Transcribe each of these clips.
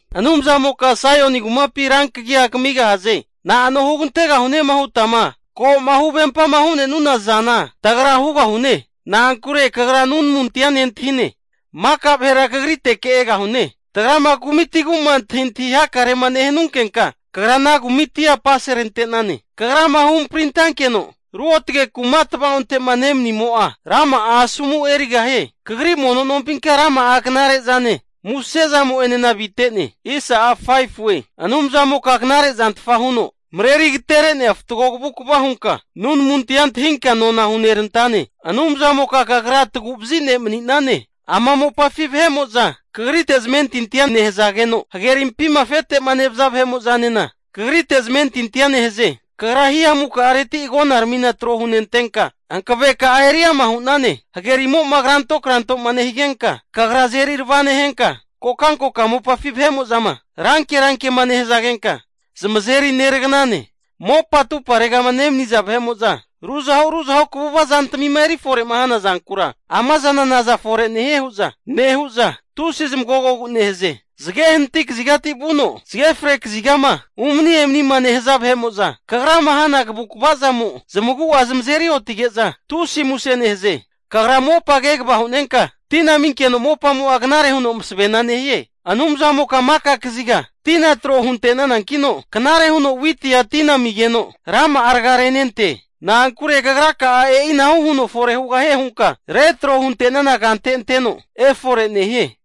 Anumzamoka Saioni kumapi rankagia kamigahaze. Na'ano hugantegahune hutama ko'ma huvempama hu'nenuna zana tagra hugahune Na'ankure Kagra nunamuntia nentahine. Maka vahera Kagriteke egahune. Tagrama kumitigu'ma antahintahi hakarema nehunkenka, Kagra ana kumitia apaserante'nane. Kagrama huhamprintankeno, ruotge kuma tava'onte'ma nemanimo'a rama'a asomu erigahie. Kagri mono nompinka rama'a knare zane musezamo'enena avite'ne. Anumzamoka knarezantfa huno mareri agatere'nea fatgo kavukva hunka nunamuntia antahinka nona hunerantane. Anumzamoka Kagra tagu'vazi ne' mani'nane. Ama mopafi vahe'mo'za Kagrite zamentintia nehazageno, hagerimpima afetema nemaniza vahe'mo'zanena kagrite zamentintia nehaze. Kagra hihamukareti agonaramina trohunentenka, hanaveka'a eri ama hu'nane. Hagerimo'ma krantokrantoma nehigenka, Kagra azeri arava nehenka, kokankoka mopafi vahe'mo'zama rankerankema nehazagenka, zamazeri neraganane. Mopa atumparegama nemaniza vahe'mo'za ruzahu ruzahu kaguva zantamima erifore'ma hana zankura, ama zana, naza fore nehie hu'za nehu'za, tusi zamagogogu nehaze. Zage hanati kazigati vuno zage fre kazigama umani emanima nehaza vahe'mo'za Kagrama hana kavukvamo zamagu'a zamazeri otige'za tusi muse nehaze. Kagra mopa kegava hunenka tina aminkeno mopamo'a knare huno masavena nehie. Anumzamoka maka kaziga tina tro hunte'nanankino, knare huno witia tina amigeno, rama'a raga renente. Na'ankure Kagraka'a e'inahu huno fore hugahie hunka retro hunte'nana kante anteno efore nehie.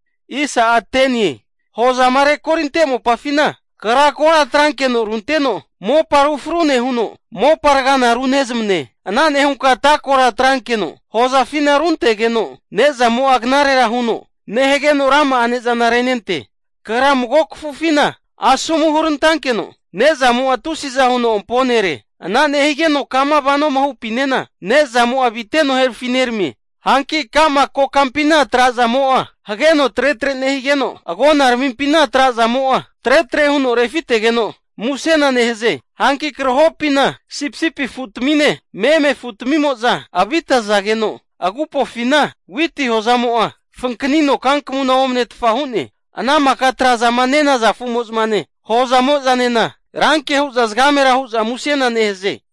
Hozama rekorinte mopafina Kagra kora atrankeno runteno mopa ru fru nehuno, mopa ragana runezmane. Ana nehunka ata kora atrankeno hozafina runtegeno ne'zamo'a knarera huno nehageno rama'a ne'zana renente. Kagra mago kafufina asomu hurantankeno, ne'zamo'a tusi'za huno amponere. Ana nehigeno kama vanoma hupinena nezamo'a aviteno herafineramie. Hanki ka'ma kokampina trazamo'a hageno tretre nehigeno, agonaramimpina trazamo'a tretre huno refitegeno musena nehaze. Hanki krahopina sipisipi afutamine, meme afutamimo'za avitazageno, agupofina witi hozamo'a fankanino kankmuna omnetfa hu'ne. Ana maka trazama nenaza afu'mozane hozamozanena ranke hu'za zagamera hu'za musena nehaze.